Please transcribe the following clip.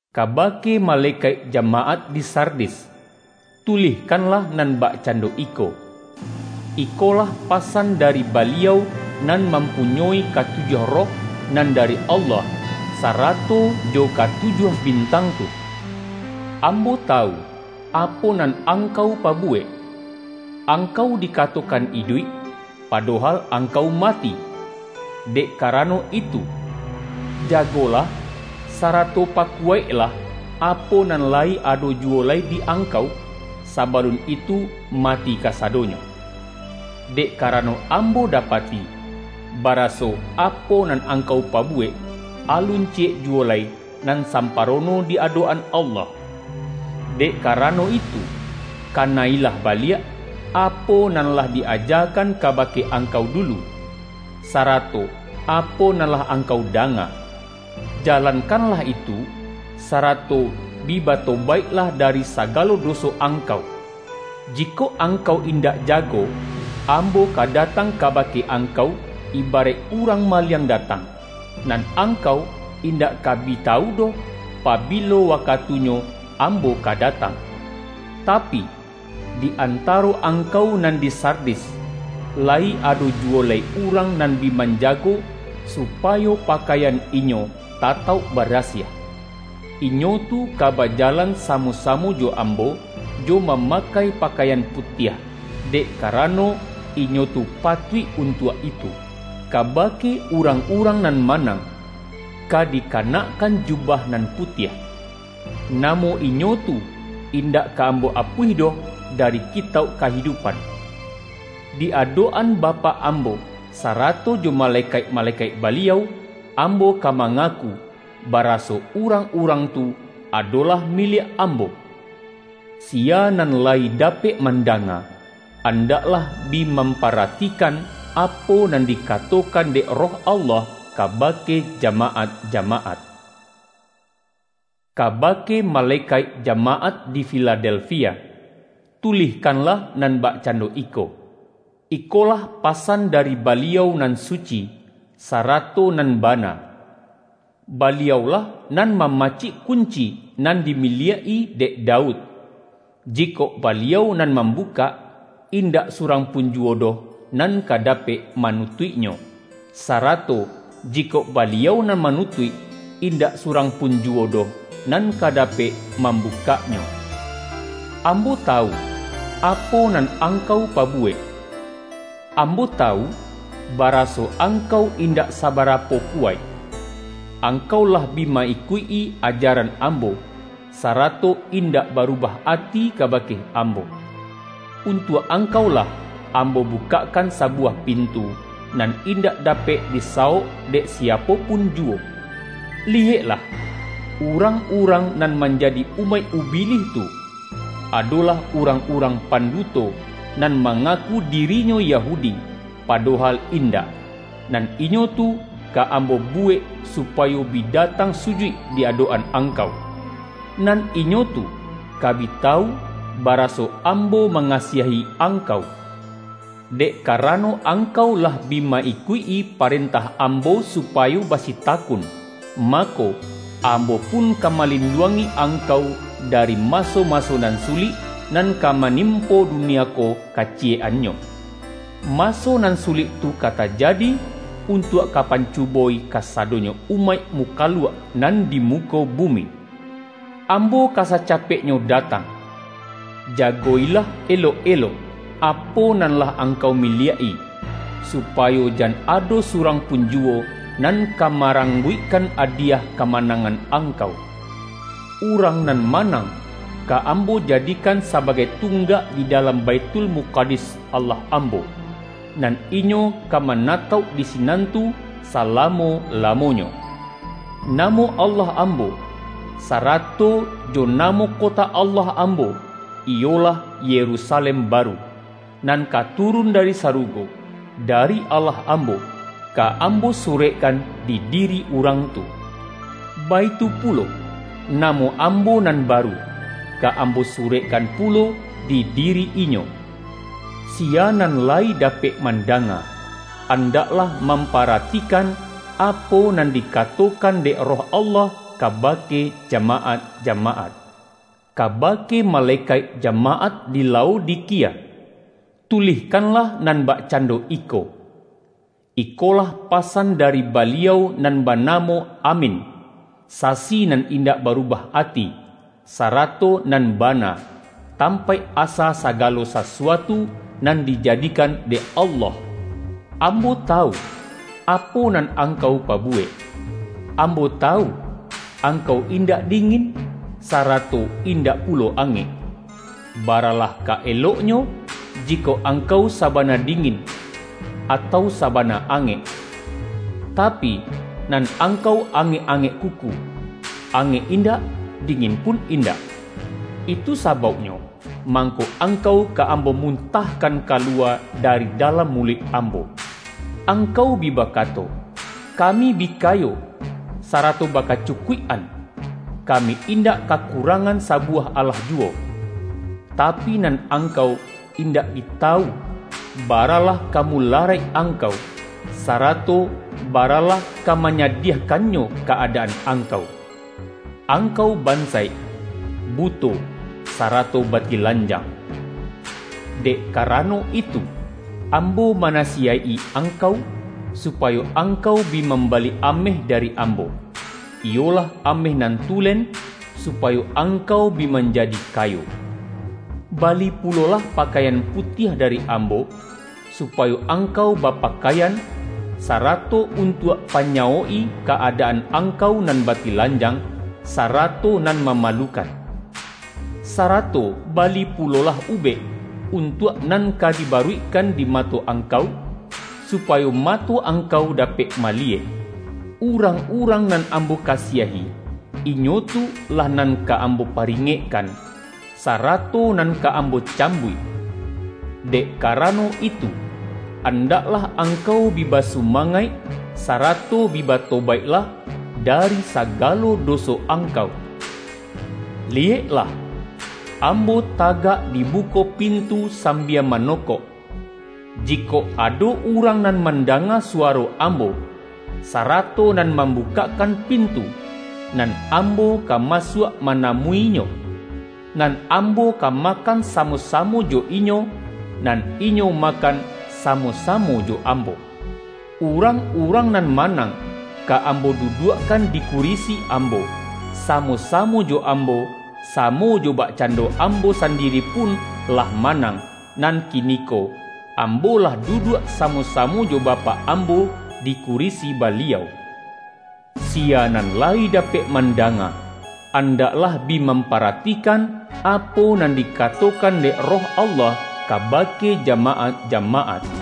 ”Kabake malekaik jamaat di Sardis, tulihkanlah nan bakcando iko: Ikolah pasan dari Baliau nan mampunyoi katujuah Roh nan dari Allah, sarato jo katujuah bintang tu. Ambo tawu, apo nan angkau pabu-wek. Angkau dikatokan iduik, pado-hal angkau mati! Dek karano itu, ja-golah, sarato pakuwaiklah, apo nan layi ado juwo lai di angkau, sabalun itu mati kasadonyo. Dek karano Am-bo dapati, baraso apo nan angkau pa-buwek, alun ciyek juwo lai nan sam-parono di adok-an Allah. Dek karano itu, kana-ilah baliak, apo nan lah di-ajakan kabake angkau dulu, sarato apo nan lah angkau danga. Jalankan-lah itu, sarato bi batobaiklah dari sa-galo doso angkau. Jikok angkau indak jago, Ambo ka datang kabake angkau, ibaraik urang maliang datang; nan angkau indak ka bi tawu doh, pabilo wakatunyo Ambo ka datang. Tapi, di antaro angkau nan di Sardis, layi ado juwo lai urang nan bi manjago, supa-yo pakaian inyo tatauk barasiah. Inyo tu ka bajalan samo-samo jo Ambo, jo mamakai pakaian putiah, dek kara-no, inyo tu patuik untuak itu. Kaba-ke urang-urang nan manang, ka dikanakkan jubah nan putiah. Namo inyo tu, indak ka Ambo apuih doh dari Ki-tauk Kahidupan. Di adok-an Bapak Ambo, sarato jo malekaik-malekaik Baliau, Ambo ka mangaku, baraso urang-urang tu adolah miliak Ambo. Siya nan layi dapek mandanga, an-daklah bi mamparatikan, apo nan di-katokan dek Roh Allah kabake jama-at-jamaat!” ”Kabake malekaik jamaat di Fi-ladelfia, tulihkanlah nan bakcando iko: Ikolah pasan dari Baliau nan suci, sarato nan bana. Baliau-lah nan ma-macik kunci nan dimiliak-i dek Daud; jikok Baliau nan mambukak, indak surang pun juwo doh nan ka dapek manutuiknyo, sarato jikok Baliau nan manutuik, indak surang pun ju-wo doh nan ka dapek mambukaknyo. Ambo tawu, apo nan angkau pabu-wek. Ambo tawu, baraso angkau in-dak sabarapo kuwaik; angkau lah bi ma-ikuik-i ajaran Ambo, sarato indak barubah ati kabake Ambo. Untuak angkau lah Ambo bukakkan sabuwah pintu, nan indak dapek disawok dek siapo pun juwo. Liyeklah: Urang-urang nan manjadi umaik Ubilih tu, adolah urang-urang panduto, nan ma-ngaku dirinyo Yahudi, padohal indak, nan inyo tu ka Ambo buwek supayo bi datang sujuik di adok-an angkau. Nan inyo tu ka bi tawu, baraso Am-bo mangasiahi angkau. Dek kara-no angkau lah bi ma-ikuik-i parentah Ambo, supayo basitakun, mako, Am-bo pun ka malinduangi angkau dari maso-maso nan sulik, nan ka manim-po dunia ko kaciyek-annyo. Maso nan sulik tu ka tajadi, untuak ka pancu-bo-i kasadonyo umaik mukaluak nan di muko bumi. Ambo ka sacapek-nyo datang! Jago-ilah elok-elok apo nan lah angkau miliak-i, supayo jan ado surang pun juwo, nan ka marang-guikkan adiyah kamanangan angkau. Urang nan manang, ka Ambo jadi-kan sabagai tunggak di dalam Baithul-mukadis Allah Ambo, nan inyo ka ma-natauk di sinan tu salamo-lamonyo. Namo Allah Ambo, sarato jo namo kota Allah Ambo-- iyolah Yerusalem baru, nan ka turun dari sarugo, dari Allah Ambo-- ka Ambo surekkan di diri urang tu. Baitu pulo, namo Am-bo nan baru, ka Ambo surekkan pu-lo di diri inyo. Siya nan layi dapek mandanga, andaklah mamparatikan, apo nan di-katokan dek Roh Allah kabake jama-at-jamaat!” ”Kabake malekaik jamaat di Lao-dikia, tulihkanlah nan bakcando iko: Ikolah pasan dari Baliau Nan Banamo Amin, Sasi nan indak baru-bah ati, sarato nan bana, tampaik asa sagalo sasuatu nan dijadikan dek Allah. Ambo tawu, apo nan angkau pabuwek; Ambo tawu, angkau indak dingin, sarato indak pulo angek. Ba-ralah ka eloknyo, jikok angkau saba-na dingin, atau sabana angek! Tapi, nan angkau angek-angek kuku; angek indak, dingin pun indak. Itu sabauk-nyo, mangko angkau ka Ambo mutah-kan kaluwa dari dalam muluik Ambo. Angkau bi bakato, ’Kami bi kayo, sarato bakacukuik-an; kami indak ka-kurangan sabuwah alah juwo.’ Tapi, nan angkau indak bi tawu, baralah ka mularaik angkau, sarato baralah ka manyadiahkannyo ka-adaan angkau! Angkau bansaik, buto, sarato batilan-jang. Dek karano itu, Ambo manasi-yaik-i angkau, supayo angkau bi mam-bali ameh dari Ambo, iyolah ameh nan tulen, supayo angkau bi manjadi kayo. Bali pulolah pakaian putiah dari Ambo, supayo angkau bapakaian, sarato untuak panyawok-i ka-adaan angkau nan batilanjang, sarato nan mamalu-kan. Sarato bali pulolah ubek, untuak nan ka dibaruikkan di mato angkau, supayo mato angkau dapek maliyek. Urang-urang nan Ambo kasiahi, inyo tu lah nan ka Ambo paringekkan, sarato nan ka Ambo cambuik. Dek ka-rano itu, andaklah angkau bi basuma-ngaik, sarato bi batobaiklah dari sa-galo doso angkau. Liyeklah! Ambo tagak di muko pintu sambia manokok. Jikok ado urang nan mandanga suwa-ro Ambo, sarato nan mambukakkan pintu, nan Ambo ka masuak manamu-inyo; nan Ambo ka makan samo-samo jo inyo, nan inyo makan samo-samo jo Ambo. Urang-urang nan manang, ka Ambo duduakkan di kurisi Ambo, samo-samo jo Ambo, samo jo bakcan-do Ambo sandiri pun lah manang, nan kiniko Ambo lah duduak samo-samo jo Bapak Ambo, di kurisi Baliau. Siya nan layi dapek mandanga, andaklah bi mamparatikan, apo nan dikatokan dek Roh Allah kabake ja-maat-jamaat!”